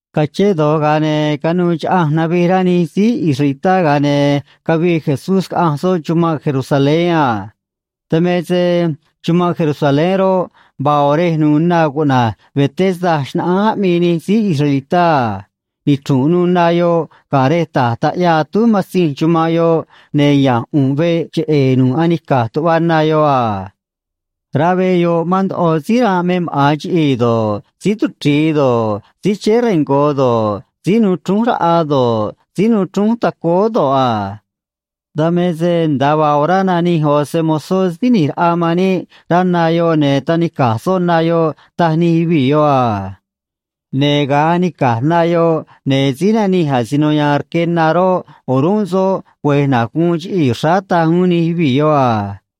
Cachén do̱j, ga̱a ne̱ canuû chaꞌanj navij rá nij síí israelitá, ga̱a ne̱ cavii Jesús caꞌanj soꞌ chumanꞌ Jerusalén a. Dan me se chumanꞌ Jerusalén roꞌ, vaa ꞌo̱ rej nu̱u̱ na cuꞌna̱j Betesda xnaꞌánj aꞌmii nij síí israelitá a. Nichru̱nꞌ nu̱u̱ na yoꞌ ga̱ rej ta̱j taꞌyaa atúj matzinj chumanꞌ yoꞌ, ne̱ ya̱nj ꞌu̱nꞌ veꞌ cheꞌe̱e̱ nu̱ꞌ anica̱j tuꞌva na yoꞌ a. Rá veꞌ yoꞌ mán ndoꞌo síí ranꞌ me maꞌa̱n chiꞌii̱ do̱ꞌ, síí tuchri̱i do̱ꞌ, síí chéé rengo̱ do̱ꞌ, síí nuu chrúnj raꞌa do̱ꞌ, síí nuu chrúnj tacóó do̱ꞌ a. Dan me se nda̱a vaa orá nanij ꞌo̱ se‑mo̱zó Síí ꞌNi̱j Raꞌa man níꞌ rá na yoꞌ, ne̱ tanica̱j soꞌ na yoꞌ, taj nij yuvii̱ yoꞌ a. Ne̱ ga̱a anica̱j na yoꞌ, ne̱ síí nanij asino ya̱a̱n rque na roꞌ, o̱rúnꞌ soꞌ güe̱j na̱j guun chiꞌii̱ xráá, taj uún nij yuvii̱ yoꞌ a.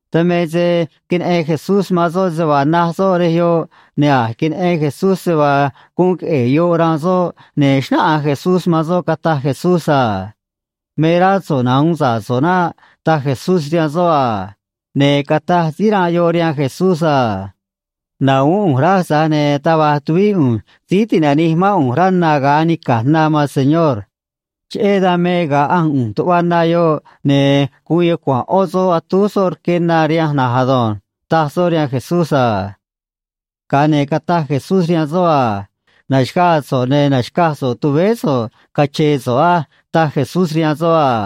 Dan me se queneꞌen Jesús man soꞌ se vaa na̱j soꞌ rej yoꞌ, ne̱ a̱j queneꞌen Jesús se vaa guun queꞌe̱e̱ yoꞌ ranꞌ soꞌ, ne̱ xnáꞌanj Jesús man soꞌ, cataj Jesús a: ―Me rá so̱ꞌ nahu̱un sa̱ꞌ so̱ꞌ naꞌ ―taj Jesús rihaan soꞌ a. Ne̱ cataj síí ranꞌ yoꞌ rihaan Jesús a: ―Na̱huún ꞌu̱nj raj, tza̱j ne̱ taj va̱j tuvíꞌ ꞌu̱nj síí ti̱nanij mán ꞌu̱nj rá na ga̱a anica̱j na, maan señor. Cheꞌé dan me ga̱a ꞌanj ꞌu̱nj tuꞌva na yoꞌ, ne̱ guun yucua̱nꞌ ꞌó soꞌ atúj soꞌ rque na rihanj na̱nj ado̱nj ―taj soꞌ rihaan Jesús a. Ga̱a ne̱ cataj Jesús rihaan soꞌ a: ―Na̱xaga̱a̱ so̱ꞌ, ne̱ na̱xcaj so̱ꞌ tuvéé so̱ꞌ, cache̱e̱ so̱ꞌ á ―taj Jesús rihaan soꞌ a.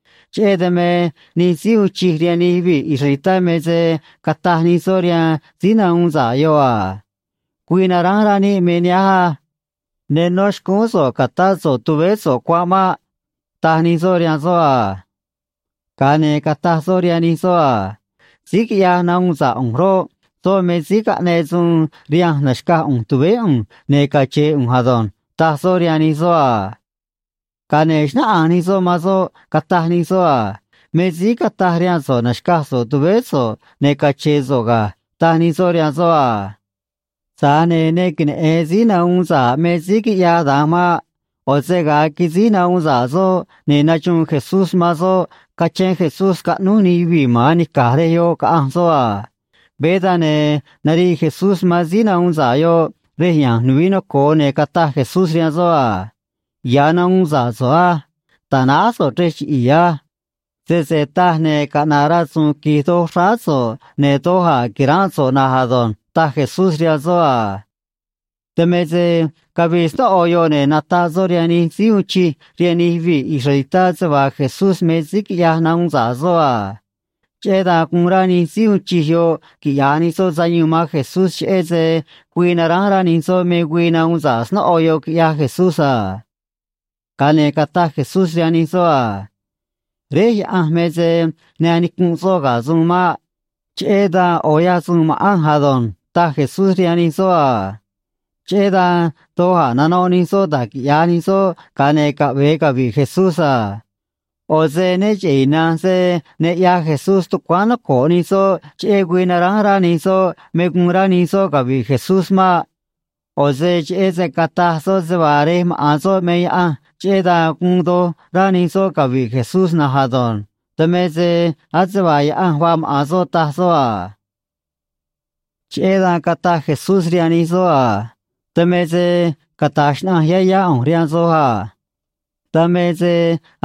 Cheꞌé dan me nij síí uun chij rihaan nij yuvii̱ israelitá me se cataj nij soꞌ rihaan síí nahuun sa̱ꞌ yoꞌ a: ―Güii naránj rá níꞌ me nihánj á. Ne nó xcúún so̱ꞌ ca̱tá so̱ꞌ tuvéé so̱ꞌ cuanꞌ maꞌ ―taj nij soꞌ rihaan soꞌ a. Ga̱a ne̱ cataj soꞌ rihaan nij soꞌ a: ―Síí quiꞌyaj nahuun sa̱ꞌ ꞌu̱nj roꞌ, soꞌ me síí caꞌneꞌ suun rihanj na̱xcaj ꞌu̱nj tuvéé ꞌu̱nj ne̱ cache̱e̱ ꞌu̱nj ado̱nj ―taj soꞌ rihaan nij soꞌ a. Ga̱a ne̱ xnáꞌanj nij soꞌ man soꞌ, cataj nij soꞌ a: ―Me síí cataj rihaan so̱ꞌ na̱xcaj so̱ꞌ tuvéé so̱ꞌ ne̱ cache̱e̱ so̱ꞌ ga̱ ―taj nij soꞌ rihaan soꞌ a. Tza̱j ne̱ ne queneꞌe̱n síí nahuun sa̱ꞌ me síí quiꞌyaj da̱nj maꞌ. ꞌO̱ se ga̱a quisíj nahuun sa̱ꞌ soꞌ, ne̱ naxuun Jesús man soꞌ cachén Jesús scaꞌnúj nij yuvii̱ ma̱n anica̱j rej yoꞌ, caꞌanj soꞌ a. Veé dan, ne̱ nariꞌ Jesús man síí nahuun sa̱ꞌ yoꞌ rej ya̱nj nuvií noco̱o, ne̱ cataj Jesús rihaan soꞌ a: ―Ya̱ nahuun sa̱ꞌ so̱ꞌ á. Ta̱náj so̱ꞌ chrej chiꞌi̱i̱ á. Sese taj, ne̱ caꞌna̱ꞌ rasu̱u̱n qui̱j doj xráá so̱ꞌ, ne̱ doj a̱ qui̱ránꞌ so̱ꞌ na̱nj ado̱nj ―taj Jesús rihaan soꞌ a. Dan me se cavii snóꞌo yoꞌ, ne̱ nataꞌ soꞌ rihaan nij síí uun chij rihaan nij yuvii̱ israelitá se vaa Jesús me síí quiꞌyaj nahuun sa̱ꞌ soꞌ a. Cheꞌé dan guun rá nij síí uun chij yoꞌ quiꞌya̱j nij soꞌ sayuun man Jesús, cheꞌé se güii naránj rá nij soꞌ me güii nahuun sa̱ꞌ snóꞌo yoꞌ, quiꞌyaj Jesús a. Ga̱a ne̱ cataj Jesús rihaan nij soꞌ a: ―Réj Yaꞌanj me se ne anicunꞌ soꞌ ga̱ suun maꞌ. Cheꞌé dan ꞌo̱ ꞌyaj suun ma̱ꞌanj ado̱nj ―taj Jesús rihaan nij soꞌ a. Cheꞌé dan doj a̱ nanoꞌ nij soꞌ da̱j quiꞌya̱j nij soꞌ, ga̱a ne̱ caꞌve̱e cavi̱ꞌ Jesús a. ꞌO̱ se né cheꞌe̱ ina̱nj se ne ꞌyaj Jesús tucuáán noco̱ꞌ nij soꞌ cheꞌé güii naránj rá nij soꞌ me guun rá nij soꞌ cavi̱ꞌ Jesús maꞌ. ꞌO̱ se cheꞌé se cataj soꞌ se vaa Rej maꞌa̱n soꞌ me Yaꞌanj, cheꞌé dan guun doj rá nij soꞌ cavi̱ꞌ Jesús na̱nj ado̱nj. Dan me se ase vaa Yaꞌanj vaa maꞌa̱n soꞌ, taj soꞌ a. Cheꞌé dan cataj Jesús rihaan nij soꞌ a: ―Dan me se cata̱j xnaꞌanj yá yá ꞌu̱nj rihaan soj a. Dan me se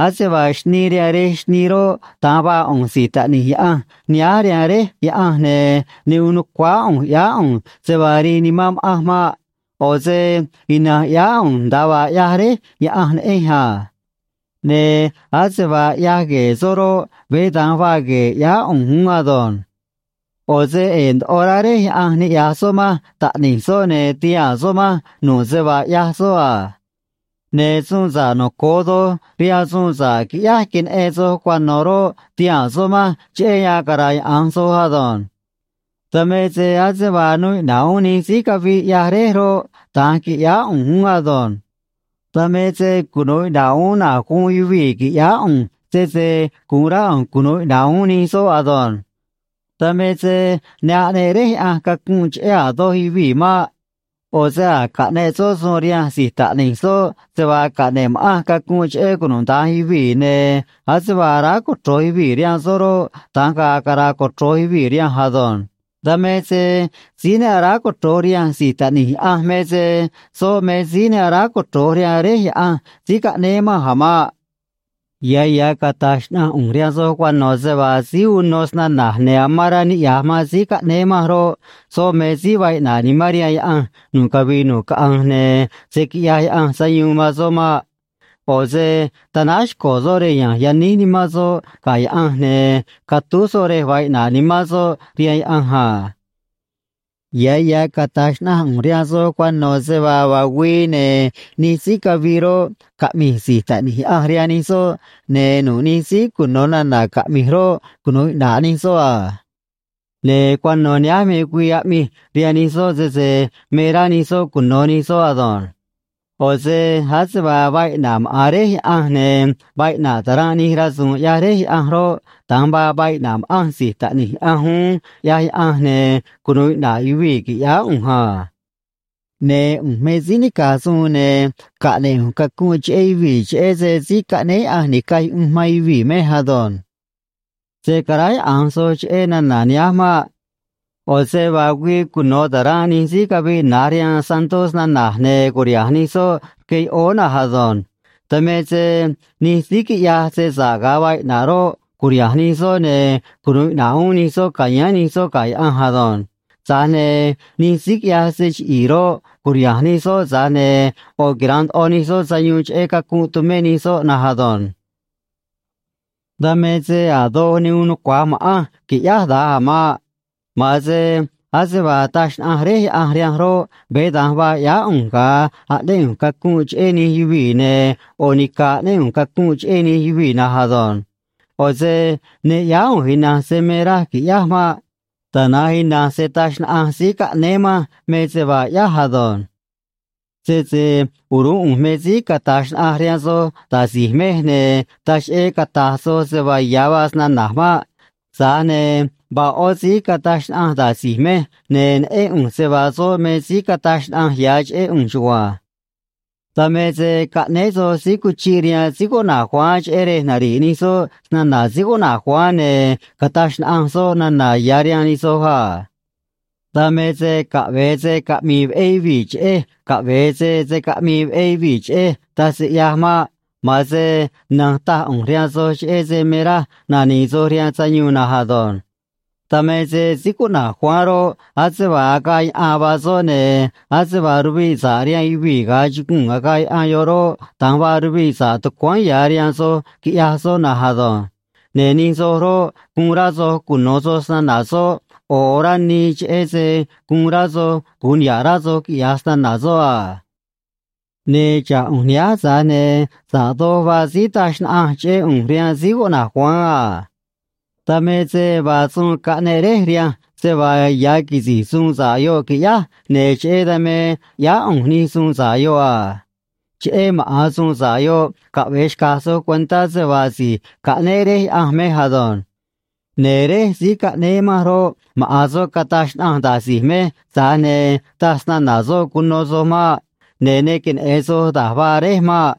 ase vaa xnii rihaan rej xnii roꞌ, da̱nj vaa ꞌu̱nj si̱j Taꞌni̱j Yaꞌanj nihánj rihaan Réj Yaꞌanj, ne̱ ne uun nu̱cuáá ꞌu̱nj ꞌyáá ꞌu̱nj se vaa rii nimán ma̱ꞌanj maꞌ. ꞌO̱ se ina̱nj ꞌyáá ꞌu̱nj nda̱a vaa ꞌyaj Réj Yaꞌanj neꞌenj a. Ne̱ ase vaa ꞌyaj gue̱e̱ soꞌ roꞌ, veé da̱nj vaa gue̱e̱ ꞌyáá ꞌu̱nj uún ado̱nj. ꞌO̱ se ꞌe̱e̱ ndoꞌo rá Réj Yaꞌanj niꞌya̱j soꞌ manj Taꞌni̱j soꞌ, ne̱ tihaa̱n soꞌ manj nu̱ꞌ se vaa ꞌyaj soꞌ a. Ne̱ suun sa̱ꞌ noco̱o doj rihaan suun sa̱ꞌ quiꞌyáj queneꞌen soj cuano̱ roꞌ, ti̱haa̱n soꞌ manj cheꞌé yan cara̱yaꞌa̱nj soj ado̱nj. Dan me se ase vaa nuu iꞌna̱ꞌ uún nij síí caviꞌ ꞌyaj Réj roꞌ, da̱nj qui̱ꞌyáá ꞌu̱nj uún ado̱nj. Dan me se cunu̱u iꞌna̱ꞌ uún na̱j guun yuvii̱ qui̱ꞌyáá ꞌu̱nj, sese gu̱un rá ꞌu̱nj cunu̱u iꞌna̱ꞌ uún nij soꞌ ado̱nj. Dan me se ne aꞌneꞌ Réj Yaꞌanj cacunꞌ cheꞌé a̱ doj yuvii̱ maꞌ. ꞌO̱ se a̱j caꞌneꞌ soꞌ suun rihanj si̱j Taꞌni̱j soꞌ se vaa caꞌne̱ꞌ ma̱ꞌanj cacunꞌ cheꞌé cunuda̱nj yuvii̱, ne̱ ase vaa aráj cochro̱j yuvii̱ rihaan soꞌ roꞌ, da̱nj ga̱a̱ cara̱a̱ cochro̱j yuvii̱ rihanj ado̱nj. Dan me se síí ne aráj cochro̱j rihanj Si̱j Taꞌni̱j Yaꞌanj me se soꞌ me síí ne aráj cochro̱j rihaan Réj Yaꞌanj síí caꞌnéé manj a̱ maꞌ. ’Ya̱ ya̱ cata̱j xnaꞌanj ꞌu̱nj rihaan soj cuano̱ se vaa síí uno snana̱j ne̱ amán rá niꞌya̱j man síí caꞌnéé manj roꞌ, soꞌ me síí vaa iꞌna̱ꞌ nimán rihaan Yaꞌanj nu̱ꞌ cavii nu̱ꞌ caꞌanj, ne̱ se̱ quiꞌyaj Yaꞌanj sayuun man soꞌ maꞌ. ꞌO̱ se tanáj xco̱ soꞌ rej ya̱nj yaníj nimán soꞌ ga̱ Yaꞌanj ne̱ catúj soꞌ rej vaa iꞌna̱ꞌ nimán soꞌ rihaan Yaꞌanj a. Ya̱ ya̱ cata̱j xnaꞌanj ꞌu̱nj rihaan soj cuano̱ se vaa vaa güii, ne̱ nij síí caviꞌ roꞌ, caꞌmi̱j si̱j Taꞌni̱j Yaꞌanj rihaan nij soꞌ, ne̱ nu̱ꞌ nij síí cuno̱ nana̱ caꞌmi̱j roꞌ, cunu̱u iꞌna̱ꞌ nij soꞌ a. Ne̱ cuano̱ nihánj me güii aꞌmij rihaan nij soꞌ, sese me rá nij soꞌ cuno̱ nij soꞌ ado̱nj. ꞌO̱ se ase vaa vaa iꞌna̱ꞌ maꞌa̱n Réj Yaꞌanj, ne̱ vaa iꞌna̱ꞌ ta̱ranꞌ nij rasu̱u̱n ꞌyaj Réj Yaꞌanj roꞌ, da̱nj vaa vaa iꞌna̱ꞌ ma̱ꞌanj si̱j Taꞌni̱j Yaꞌanj uún, ꞌyaj Yaꞌanj, ne̱ cunu̱u iꞌna̱ꞌ yuvii̱, qui̱ꞌyáá ꞌu̱nj a. Ne̱ ꞌu̱nj me síí nica̱j suun, ne̱ caꞌne̱ꞌ ꞌu̱nj cacunꞌ cheꞌé yuvii̱, cheꞌé se Síí Caꞌnéé Yaꞌanj Ni̱caj Yuꞌunj man Yuvii̱ mej ado̱nj. ’Se̱ caráyaꞌa̱nj soj cheꞌé nana̱ nihánj maꞌ. ꞌO̱ se vaa güii cuno̱ ta̱ranꞌ nij síí caviꞌ na̱j rihaan santó snana̱j, ne̱ cu̱riha̱nj nij soꞌ rque yoꞌóó na̱nj ado̱nj. Dan me se nij síí quiꞌyaj se sa̱ꞌ ga̱a vaa iꞌna̱ꞌ roꞌ, cu̱riha̱nj nij soꞌ, ne̱ cunu̱u iꞌna̱ꞌ uún nij soꞌ ca̱yáán nij soꞌ ga̱ Yaꞌanj ado̱nj. Tza̱j ne̱ nij síí quiꞌyaj se chiꞌi̱i̱ roꞌ, cu̱riha̱nj nij soꞌ, tza̱j ne̱ ꞌo̱ quira̱nꞌ ndoꞌo nij soꞌ sayuun cheꞌé cacunꞌ tumé nij soꞌ na̱nj ado̱nj. ’Dan me se a̱ doj ne uun nucua̱j ma̱ꞌanj qui̱ꞌyáj da̱nj a̱ maꞌ. Ma̱an se ase vaa taj xnaꞌanj Réj Yaꞌanj rihanj roꞌ, veé da̱nj vaa ꞌyáá ꞌu̱nj ga̱a aꞌnéꞌ ꞌu̱nj cacunꞌ cheꞌé nij yuvii̱, ne̱ ꞌo̱ nica̱ aꞌnéꞌ ꞌu̱nj cacunꞌ cheꞌé nij yuvii̱ na̱nj ado̱nj. ꞌO̱ se ne ꞌyáá ꞌu̱nj ina̱nj se me raj qui̱ꞌyáj maꞌ. Tana̱nj ina̱nj se taj xnaꞌanj síí caꞌnéé manj me se vaa ꞌyáj ado̱nj. ’Sese o̱rúnꞌ ꞌu̱nj me síí cata̱j xnaꞌanj rihaan soj da̱j si̱j mej, ne̱ taj cheꞌé cata̱j soj se vaa ya̱ vaa snana̱j maꞌ. Tza̱j ne̱ vaa ꞌó síí cataj xnaꞌanj da̱j si̱j mej, ne̱ neꞌén ꞌu̱nj se vaa soꞌ me síí cataj xnaꞌanj ya̱ cheꞌé ꞌu̱nj chugua̱nj. ’Dan me se caꞌnéé soj síí cuchiꞌ rihaan síí cuꞌna̱j Juan cheꞌé rej nari̱ꞌ nij soꞌ snana̱ síí cuꞌna̱j Juan, ne̱ cataj xnaꞌanj soꞌ nana̱ ya̱ rihaan nij soj a. (Dan me se caꞌve̱e se caꞌmi̱i̱ veꞌé yuvii̱ cheꞌej caꞌve̱e se se̱ caꞌmii veꞌé yuvii̱ cheꞌej, taj se ꞌyaj maꞌ. Ma̱an se na̱nj taj ꞌu̱nj rihaan soj cheꞌé se me raj nani̱i̱ soj rihaan sayuun na̱nj ado̱nj.) Dan me se síí cuꞌna̱j Juan roꞌ, ase vaa agaꞌ yaꞌan vaa soꞌ, ne̱ ase vaa ruviꞌ sa̱ꞌ rihaan yuvii̱ ga̱a chuguu̱n agaꞌ yaꞌan yoꞌ roꞌ, da̱nj vaa ruviꞌ sa̱ꞌ tucuáán ya̱ rihaan soj quiꞌyaj soꞌ na̱nj ado̱nj. Ne̱ nij soj roꞌ, guun rá soj cuno̱ soj snana̱ soꞌ ꞌo̱ orá nii, cheꞌé se guun rá soj gu̱un niha̱ꞌ rá soj, quiꞌya̱j snana̱ soꞌ a. ’Ne̱ xa̱ꞌ ꞌu̱nj nihánj, tza̱j ne̱ sa̱ꞌ doj vaa síí taj xnaꞌanj cheꞌé ꞌu̱nj rihaan síí cuꞌna̱j Juan a. Dan me se vaa suun caꞌneꞌ Réj rihanj se vaa ya̱ quisi̱j suun sa̱ꞌ yoꞌ qui̱ꞌyáj, ne̱ cheꞌé dan me ꞌyáá ꞌu̱nj nij suun sa̱ꞌ yoꞌ a. Cheꞌé maꞌa̱n suun sa̱ꞌ yoꞌ caꞌve̱e xca̱j soj cuentá se vaa si̱j caꞌnéé Réj Yaꞌanj mej ado̱nj. Ne̱ Réj síí caꞌnéé manj roꞌ, maꞌa̱n soꞌ cataj xnaꞌanj da̱j si̱j mej, tza̱j ne̱ taj snana̱ soꞌ cuno soj maꞌ. Ne̱ ne queneꞌe̱n soj da̱j vaa Réj maꞌ.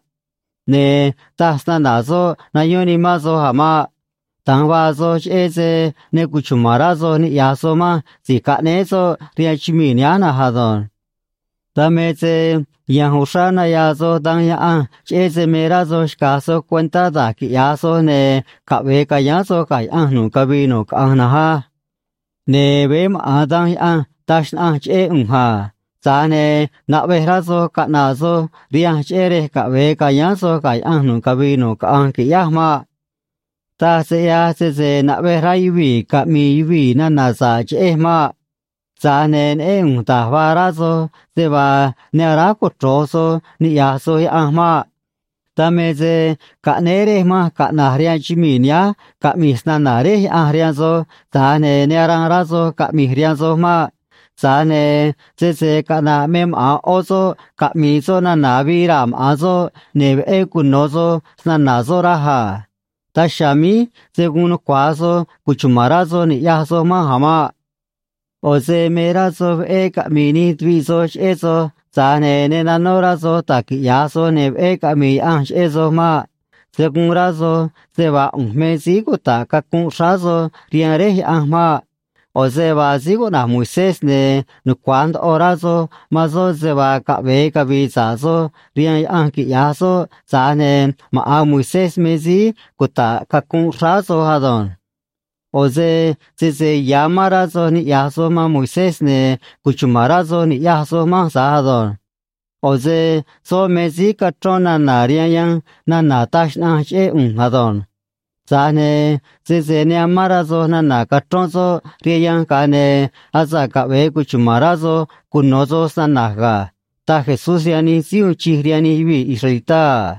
Ne̱ taj snana̱ soꞌ nayón nimán soj a̱ maꞌ. Da̱nj vaa soj, cheꞌé se ne cuchuma̱n rá soj ni̱ꞌyaj soj manj si̱j caꞌnéé soꞌ rihaan chumii̱ nihánj na̱nj ado̱nj. Dan me se ya̱nj uxrá nayaa soj Danj Yaꞌanj, cheꞌé se me rá soj xca̱j soj cuentá da̱j quiꞌya̱j soj ne̱ caꞌve̱e ca̱yáán soj ga̱ Yaꞌanj nu̱ꞌ cavii nu̱ꞌ caꞌanj na̱nj á. Ne̱ veé maꞌa̱n Danj Yaꞌanj taj xnaꞌanj cheꞌé ꞌu̱nj a. Tza̱j ne̱ naꞌvej rá soj caꞌna̱ꞌ soj rihanj, cheꞌé rej caꞌve̱e ca̱yáán soj ga̱ Yaꞌanj nu̱ꞌ cavii nu̱ꞌ caꞌanj qui̱ꞌyáj maꞌ. ’Taj se ꞌyaj sese naꞌvej rá yuvii̱ caꞌmi̱i̱ yuvii̱ nana̱ sa̱ꞌ cheꞌej maꞌ. Tza̱j ne̱ neꞌén ꞌu̱nj da̱j vaa rá soj, se vaa ne aráj cochro̱j soj niꞌya̱j soj Yaꞌanj maꞌ. Dan me se caꞌnéé Réj manj caꞌna̱j rihaan chumii̱ nihánj caꞌmi̱j snana̱ Réj Yaꞌanj rihaan soj, tza̱j ne̱ ne aranꞌ rá soj caꞌmi̱j rihaan soj maꞌ. Tza̱j ne̱ sese caꞌna̱ꞌ me maꞌa̱n ꞌó soꞌ caꞌmi̱i̱ soꞌ nana̱ avii raa̱ maꞌa̱n soꞌ, ne̱ veꞌé cuno̱ soj snana̱ soꞌ raj a. Daj chiha̱a̱ míj se̱ guun nucua̱j soj cuchuma̱n rá soj ni̱ꞌyaj soj manj a̱ maꞌ. ꞌO̱ se me rá soj veꞌé caꞌmi̱i̱ nij tuviꞌ soj cheꞌé soj, tza̱j ne̱ ne nanó rá soj da̱j quiꞌya̱j soj, ne̱ veꞌé caꞌmi̱i̱ Yaꞌanj cheꞌé soj maꞌ. Se̱ guun rá soj se vaa ꞌu̱nj me síí cuta̱ꞌ cacunꞌ xráá soj rihaan Réj Yaꞌanj maꞌ. ꞌO̱ se vaa síí cuꞌna̱j Moisés, ne̱ nucua̱j ndoꞌo rá soj man soꞌ se vaa caꞌve̱e cavi̱i̱ sa̱ꞌ soj rihaan Yaꞌanj quiꞌya̱j soꞌ, tza̱j ne̱ maꞌa̱n Moisés me síí cuta̱ꞌ cacunꞌ xráá soj ado̱nj. ꞌO̱ se sese ya̱ amán rá soj niꞌya̱j soj man Moisés, ne̱ cuchuma̱n rá soj ni̱ꞌyaj soj manj tza̱j ado̱nj. ꞌO̱ se soꞌ me síí cachrón nana̱ rihaan yanj nana̱ taj xnaꞌanj cheꞌé ꞌu̱nj ado̱nj. Tza̱j ne̱ sese ne amán rá soj nana̱ cachrón soꞌ rihaan yanj, ga̱a ne̱ asa̱ꞌ caꞌve̱e cuchuma̱n rá soj cuno̱ soj snana̱j ga̱ ―taj Jesús rihaan nij síí uun chij rihaan nij yuvii̱ israelitá a.